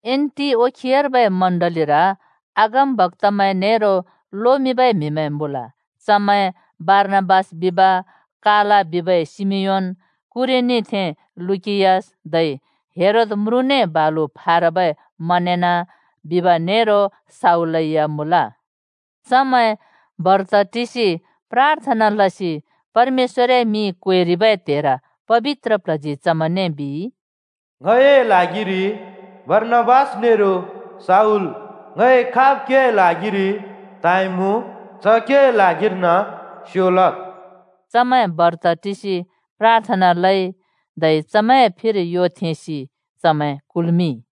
एन्‍टिओखियार्बै चर्चर अगमबक्‍तामैं नेरो लोमिंबै म्हिमैं मुँल। चमैं बारनाबास बिब, काला बिबै शिमियोन, कुरेनीथें लुकियस, धै हेरोद म्रुँने बालु फारबै मनेन बिब नेरो शाऊलै या मुँल। चमैं बर्त टिसि प्राथना लसि परमेश्‍वरए मिं क्वेरिबै त्हेर पबित्र प्ल्हजी चमैंने बिइ, “ङए ल्हागिरि बारनाबास नेरो शाऊल ङइ खाब् केए ल्हागिरि त्हाँइमुँ च केए ल्हागिर्न स्यो लद्।” चमैं बर्त टिसि प्राथना लइ, धै चमैंए फिरि यो थेंसि चमैं कुल्मिंइ।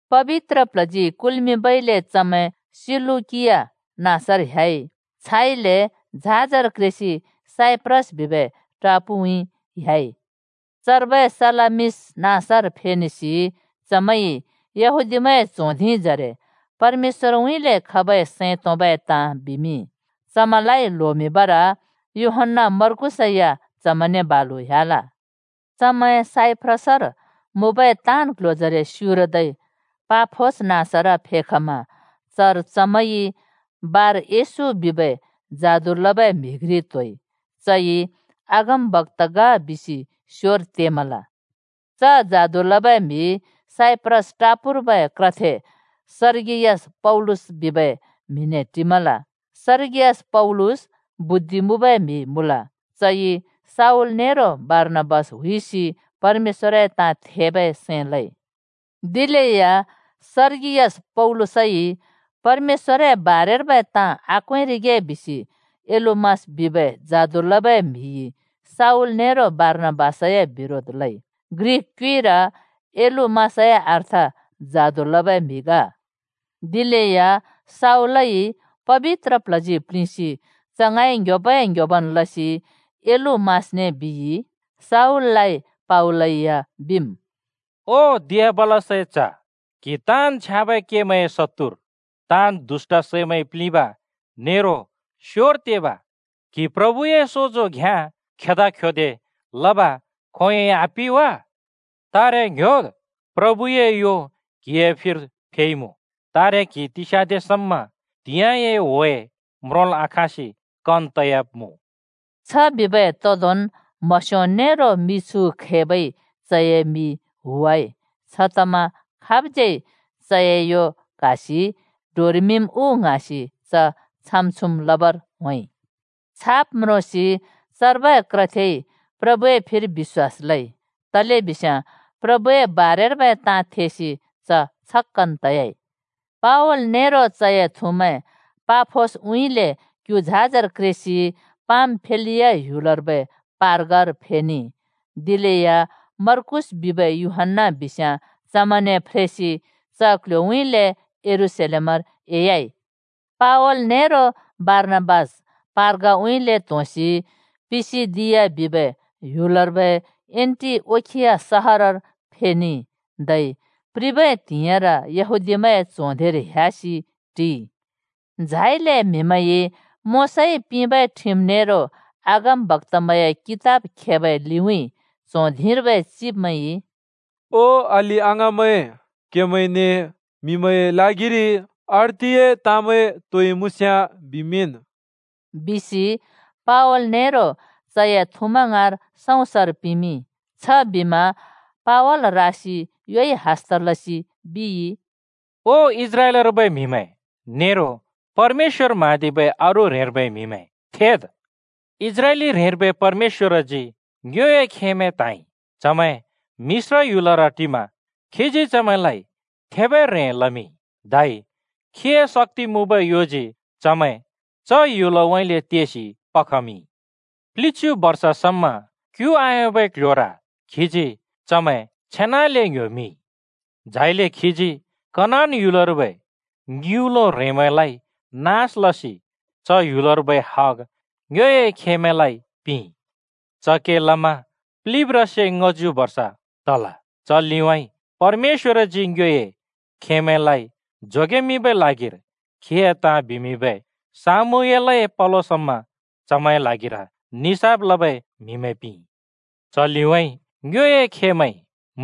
पबित्र प्ल्हजी कुल्मिंबइले चमैं सिलुकिया नाँसर ह्‍याइ, छाइले झाजर क्रेसि साइप्रस बिबै टापुएउँइँ ह्‍याइ। चर्बै सलामिस नाँसर फेनेसि चमैंइ येहूदिमैंए च्हों धिंजरे परमेश्‍वरए सैं तोंबै ताँ बिमिंइ। चमैंलाइ ल्होमिंबर यूहन्‍ना मार्कुसै या चमैंने बालु ह्‍याल। चमैं साइप्रसर मुँबै ताँन् क्ल्ह्‍योजरे स्युरदै पाफोस नाँसर फेखमा चर चमैंइ बार-येशू बिबै जादु लबै म्हि घ्रि त्होइ। चइ अगमबक्‍ता ग बिसि स्योर तेमल। च जादु लबै म्हि साइप्रस टापूर्बै क्रथे सर्गियस पौलुस बिबै म्हिने टिमल। सर्गियस पौलुस बुद्धि मुँबै म्हि मुँल। चइ शाऊल नेरो बारनाबास हुइसि परमेश्‍वरए ताँ थेबै सैं लइ। दिलेया सर्गियस पौलुसइ परमेश्‍वरए ताँ आक्वेंरिगे बिसि एलुमास बिबै जादु लबै म्हिइ शाऊल नेरो बारनाबासए बिरोध लइ। (ग्रिक क्युइर एलुमासए अर्थ जादु लबै म्हि ग।) दिलेया शाऊललाइ पबित्र प्ल्हजी प्लिंसि च ङाँइ ङ्‍ह्‍योबै-ङ्‍ह्‍योबन् लसि एलुमासने बिइ (शाऊललाइ पावलै या बिमुँ): “ओ दियाबलसए च्ह! क्हि ताँन् छ्याँबै केमैंए शत्तुर, ताँन् दुष्‍ट सैमैंइ प्लिंब नेरो स्योर तेब! क्हि प्रभुए सोजो घ्याँ खेदा-ख्योदे लब खोंयोंन् बिलै आपि वा? तारे ङ्‍ह्‍योद्, प्रभुए यो क्हिए फिर फेइमुँ! तारे क्हि तिस्याँदे समा त्हिंयाँए ह्‍वे म्रोंल् आखाँसि कन तयाब्मुँ।” छबिबै तोंदोंन् म्हस्यो नेरो मिछु खैबइ चए मि हुवाइ। छतमा खाबज्यै चए यो क्हासि डोरेमिंम् उ ङ्हाँसि च छाम-छुम् लबर होंइ। चु ताँ म्रोंसि चर्बै क्रथेइ प्रभुए फिर बिश्‍वास लइ, तलेबिस्याँ प्रभुए बारेर्बै ताँ थेसि च छक्‍कन् तयाइ। पावल नेरो चए थुमैं पाफोसउँइँले क्‍यु झाजर क्रेसि पामफिलिया ह्‍युलर्बै पर्गार फेनेइ। दिलेया मर्कूस बिबै यूहन्‍ना बिस्याँ चमैंने फ्रेसि च क्ल्ह्‍योउँइँले यरूशलेमर एह्‍याइ। पावल नेरो बारनाबास पर्गाउँइँले त्होंसि पिसिदिया बिबै ह्‍युलर्बै एन्‍टिओखिया सहरर फेनेइ, धै प्रिबै त्हिंइर यहूदीमैंए च्हों धिंर ह्‍यासि टिइ। झाइले म्हिमैंइ मोशाइ पिंबै ठिम नेरो अगमबक्‍तामैंए कितब खेबै लिउँइँ च्हों धिंर्बै चिब्मैंइ, “ओ अलि-अङाँमैं, क्हेमैंने म्हिमैंए ल्हागिरि अर्तिए ताँमैं तोइ मुँस्याँ बिमिंन्,” बिसि पावल नेरो चए थुमैं ङाँर सँउँसर पिमिंइ। छबिमा पावल रासि योइ हस्त लसि बिइ: “ओ इस्राएलर्बै म्हिमैं नेरो परमेश्‍वर म्हाँदिबै अरू ह्रेंर्बै म्हिमैं, थेद्। इस्राएली ह्रेंर्बै परमेश्‍वरजी ङ्योए खेमैं त्हाँइ। चमैं मिश्र ह्‍युलर टिमा खीजी चमैंलाइ थेबै ह्रें लमिंइ, धै खीए शक्‍ति मुँबै योजी चमैं च ह्‍युलउँइँले तेसि पखमिंइ। प्लिच्यु बर्ष समा क्यु आयोंबै क्ल्ह्‍योर खीजी चमैं छेनाले ङ्‍ह्‍योमिंइ। झाइले खीजी कनान ह्‍युलर्बै ङिउँलो ह्रेंमैंलाइ नास लसि च ह्‍युलर्बै हग ङ्योए खेमैंलाइ पिंइ। च के लमा प्लिब्ब्रासे ङ्‍हच्यु बर्ष तल। “च लिउँइँ परमेश्‍वरजी ङ्योए खेमैंलाइ जोगेमिंबै ल्हागिर खीए ताँ बिमिंबै शामूएलए पलो समा चमैंए ल्हागिर निसाफ लबै म्हिमैं पिंइ। च लिउँइँ ङ्योए खेमैंइ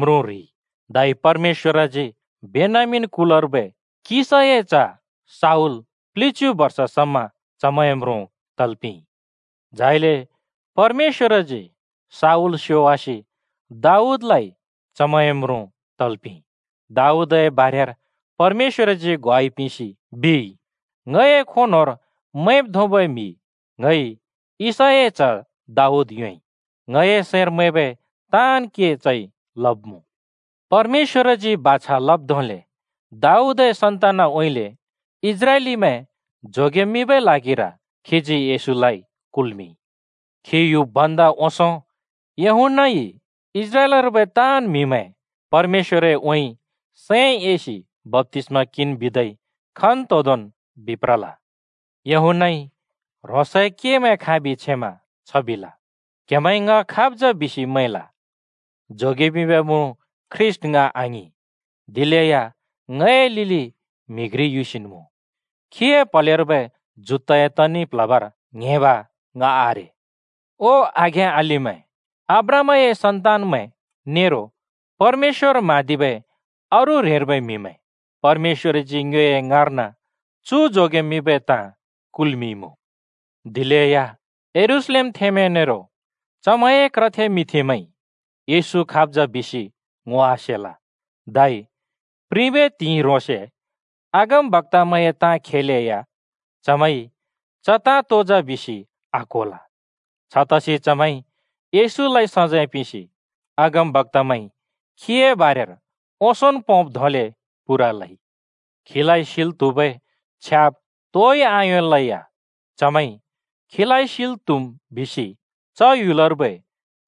म्रुँ ह्रिइ, धै परमेश्‍वरजी बेन्यामीन कुलर्बै किशाए च्ह शाऊल प्लिच्यु बर्ष समा चमैंए म्रुँ तल् पिंइ। झाइले परमेश्‍वरजी शाऊल स्योवासि दाऊदलाइ चमैंए म्रुँ तल् पिंइ। दाऊदए बारेर परमेश्‍वरजी ग्वाइ पिंसि बिइ, ‘ङए खों न्होंर मैंब् धोंबै म्हि ङइ यिशैए च्ह दाऊद योंइ। ङए सैंर मैंबै ताँन् के चइ लब्मुँ।’ परमेश्‍वरजी बाछा लब् धोंले दाऊदए सन्तानउँइँले इस्राएलीमैं जोगेमिंबै ल्हागिर खीजी येशूलाइ कुल्मिंइ। खी युब् भन्दा ओंसों यूहन्‍नाइ इस्राएलर्बै ताँन् म्हिमैं परमेश्‍वरउँइँ सैं एसि बप्‍तिस्मा किंन् बिदै खन्तोंदोंन् बिप्रल। यूहन्‍नाइ ह्रोंसए केमैं खाँबि छेमा छ बिल, ‘क्हेमैंइ ङ खाब् जा बिसि मैंल? जोगेमिंबै म्रुँ ख्रीष्‍ट ङ आङिं। दिलेया ङए लिउँइँ म्हि घ्रि युसिन् मुँ, खीए प्हलेर्बै जुत्ताए तनि प्‍ल्हबर ङ्हेंब ङ आरे।’ “ओ आघें-अलिमैं, अब्राहामए सन्तान्मैं, नेरो परमेश्‍वर म्हाँदिबै अरू ह्रेंर्बै म्हिमैं! परमेश्‍वरजी ङ्योए ङाँर्न चु जोगेमिंबै ताँ कुल्मिंइँमुँ। दिलेया यरूशलेमथेंमैं नेरो चमैंए क्रथे मिंथेमैंइ येशू खाब् जा बिसि ङो आसेल, धै प्रिबै त्हिंइ ह्रोंसे अगमवक्‍तए ताँ खेलेया, चमैंइ च ताँ तो जा बिसि आक्होल। छतसि चमैंइ येशूलाइ सजैं पिंसि अगमबक्‍तामैंइ खीए बारेर ओंसोंन् पोंब् धोंले पूरा लइ। खीलाइ सिल् त्हुबै छ्याब् तोइ आयोंलेया चमैंइ खीलाइ सैल् त्हुम् बिसि च ह्‍युलर्बै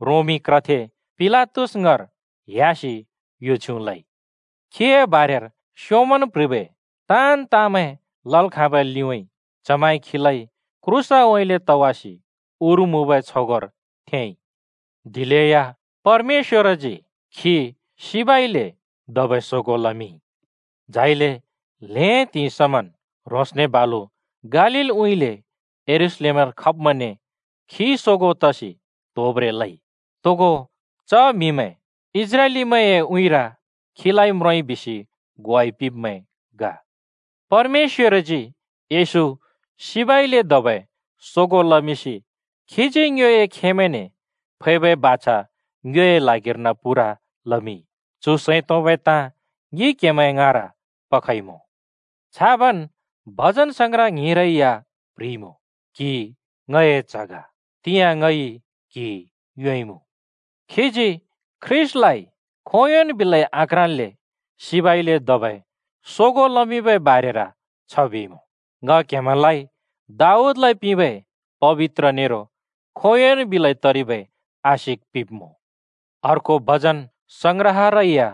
रोमी क्र थे पिलातस ङाँर ह्‍यासि यो छ्युँ लइ। खीए बारेर स्योंमन् प्ह्रिबै ताँन् ताँमैं लल् खाँबै लिउँइँ चमैंइ खीलाइ क्रूसउँइँले तवासि उर मुँबै छगोंर थेंइ। दिलेया परमेश्‍वरजी खी सिबइले धबै सोगों लमिंइ। झाइले ल्हें त्हिंइ समन् ह्रोंसने बालु गालीलउँइँले यरूशलेमर खब्मैंने खी सोगों तसि त्होब्रें लइ। तोगो च म्हिमैं इस्राएलीमैंए उँइँर खीलाइ म्रोंइ बिसि ग्वाइ पिंब्मैं ग। “परमेश्‍वरजी येशू सिबइले धबै सोगों लमिंसि खीजी ङ्योए खेमैंने फैबै बाछा ङ्योए ल्हागिर्न पूरा लमिंइ। चु सैं तोंबै ताँ ङि क्हेमैंए ङाँर पखइमुँ। छाबन् भजनसंग्रह ङ्हिंरै या प्ह्रिइमुँ, ‘क्‍हि ङए च्‍ह ग, तिंयाँ ङइ क्‍हि योंइँमुँ।’ खीजी ख्रीष्‍टलाइ खोंयोंन् बिलै आक्राँल्‍ले सिबइले धबै सोगों लमिंबै बारेर छ बिइमुँ, ‘ङ क्हेमैंलाइ दाऊदलाइ पिंबै पबित्र नेरो खोंयोंन् बिलै तरिबै आशिक पिंब्मुँ।’ अर्को भजन संग्रहरै या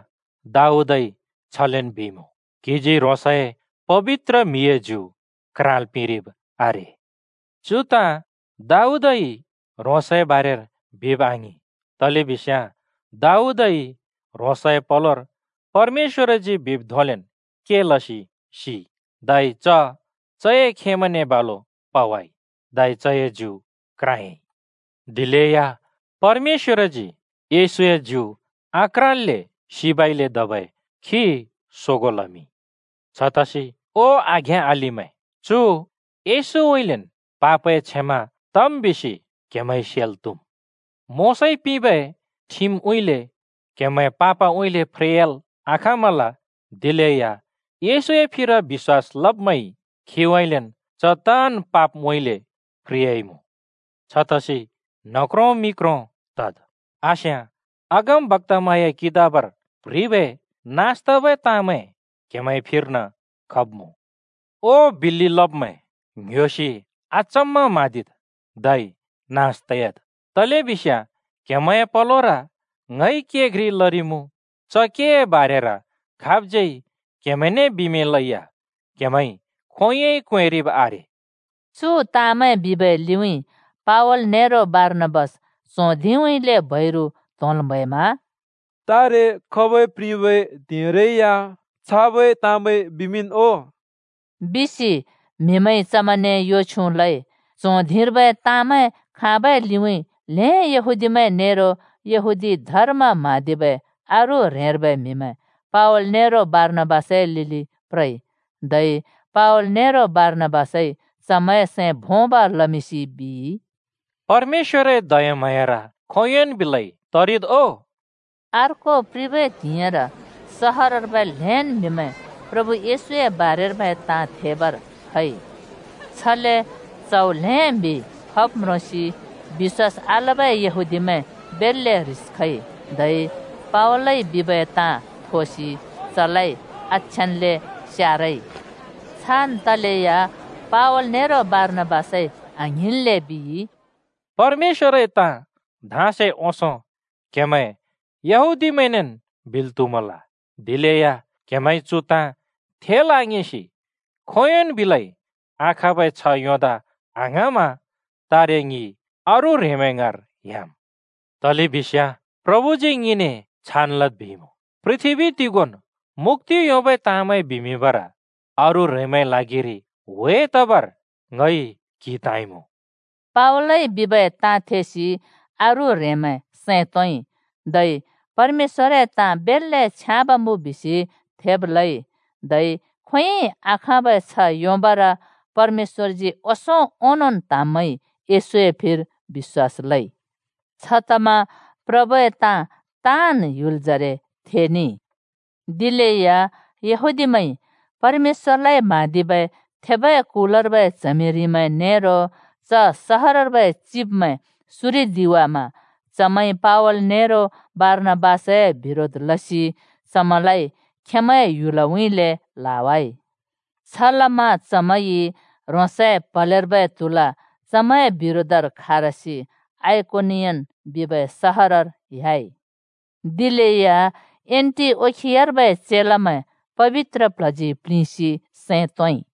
दाऊदइ छलेन् बिइमुँ, ‘क्‍हिजी ह्रोंसए पबित्र म्हिए ज्यु क्राँल् पिंरिब् आरे।’ चु ताँ दाऊदइ ह्रोंसए बारेर बिब आङिं, तलेबिस्‍याँ दाऊदइ ह्रोंसए पलोर परमेश्‍वरजी बिब् धोंलेन् के लसि सिइ। धै चए खेमैंने बालु पावाइ, धै चए ज्यु क्राँयाइ। दिलेया परमेश्‍वरजी येशूए ज्यु आक्राँल्‍ले सिबइले धबै खी सोगों लमिंइ। “छतसि, ओ आघें-अलिमैं, चु येशूउँइँलेन् पापए क्षमा तम् बिसि क्हेमैंइ सेल् त्हुम्। मोशाइ पिंबै ठिमउँइँले क्हेमैं पापमैंउँइँले फ्रेयाल् आखाँमल, दिलेया येशूए फिर बिश्‍वास लब्मैंइ खीउँइँलेन् च ताँन् पापमैंउँइँले फ्रेयाइमुँ। छतसि न्ह क्रों मि क्रों तद्, आस्याँ अगमबक्‍तामैंए कितबर प्ह्रिबै नास तबै ताँमैं क्हेमैंए फिर्न खब्मुँ: ‘ओ बिल्‍लि लब्मैं! ङ्‍ह्‍योसि अचम्‍म म्हाँदिद् धै नास तयाद्, तलेबिस्याँ क्हेमैंए पलोर ङइ के घ्रि लरिमुँ। च केए बारेर खाबज्यै क्हेमैंने बिमिंलै या क्हेमैंइ खोंयोंइ क्वेंरिब् आरे।’” चु ताँमैं बिबै लिउँइँ पावल नेरो बारनाबास च्हों धिंउँइँले बैरु त्होंल् म्हैमा “तारे खबै प्रिबै त्हिंइरै या छाबै ताँमैं बिमिंन् ओ!” बिसि म्हिमैंइ चमैंने यो छ्युँ लइ। च्हों धिंर्बै ताँमैं खाँबै लिउँइँ ल्‍हें यहूदीमैं नेरो यहूदी धर्म म्‍हाँदिबै अरू ह्रेंर्बै म्‍हिमैं पावल नेरो बारनाबासए लिलि प्रइ। धै पावल नेरो बारनाबासइ चमैंए सैं भोंब लमिंसि बिइ, “परमेश्‍वरए दयाम्हाँयार खोंयोंन् बिलै तरिद् ओ।” अर्को प्रिबै त्हिंइर सहरर्बै त्हेन् म्हिमैं प्रभु येशूए बारेर्बै ताँ थेबर खइ। छले च्हौ ल्हें म्हि खब् म्रोंसि बिश्‍वास आलबै यहूदीमैं बेल्‍ले ह्रिस खइ, धै पावलइ बिबै ताँ थोसि चलाइ आछ्याँन्ले स्यारइ। छान् तलेया पावल नेरो बारनाबासइ आङ्हिंन्ले बिइ, “परमेश्‍वरए ताँ धाँसे ओंसों क्हेमैं यहूदीमैंनेन् बिल् त्हुमल। दिलेया क्हेमैंइ चु ताँ थेल् आङिंसि खोंयोंन् बिलै आखाँबै छ्ह योंदा आङ्हाँमा तारे ङि अरू ह्रेंमैं ङाँर ह्‍याम्। तलेबिस्याँ प्रभुजी ङिने छान् लद् बिइमुँ: ‘पृथ्‍बी तिगोंन् मुक्‍ति योंबै ताँमैं बिमिंबर अरू ह्रेंमैंए ल्हागिरि ह्‍वे तबर ङइ क्‍हि त्हाँइमुँ।’” पावलइ बिबै ताँ थेसि अरू ह्रेंमैं सैं तोंइ, धै परमेश्‍वरए ताँ बेल्‍ले छ्याँब मुँ बिसि थेब् लइ, धै खोंयोंन् बिलै आखाँबै छ्ह योंबर परमेश्‍वरजी ओंसों ओंनोंन् त्हाँब्मैंइ येशूए फिर बिश्‍वास लइ। छतमा प्रभुए ताँ ताँन् ह्‍युलजरे थेनेइ। दिलेया यहूदीमैंइ परमेश्‍वरलाइ म्हाँदिबै थेबै कुलर्बै च्हमिरिमैं नेरो च सहरर्बै चिब्मैं सुरिदिवामा चमैंइ पावल नेरो बारनाबासए बिरोध लसि चमैंलाइ खेंमैंए ह्‍युलउँइँले ल्हावाइ। छलमा चमैंइ ह्रोंसए प्हलेर्बै त्हुला चमैंए बिरोधर खारसि आइकोनियन बिबै सहरर ह्‍याइ। दिलेया एन्‍टिओखियार्बै चेलामैं पबित्र प्ल्हजी प्लिंसि सैं तोंइ।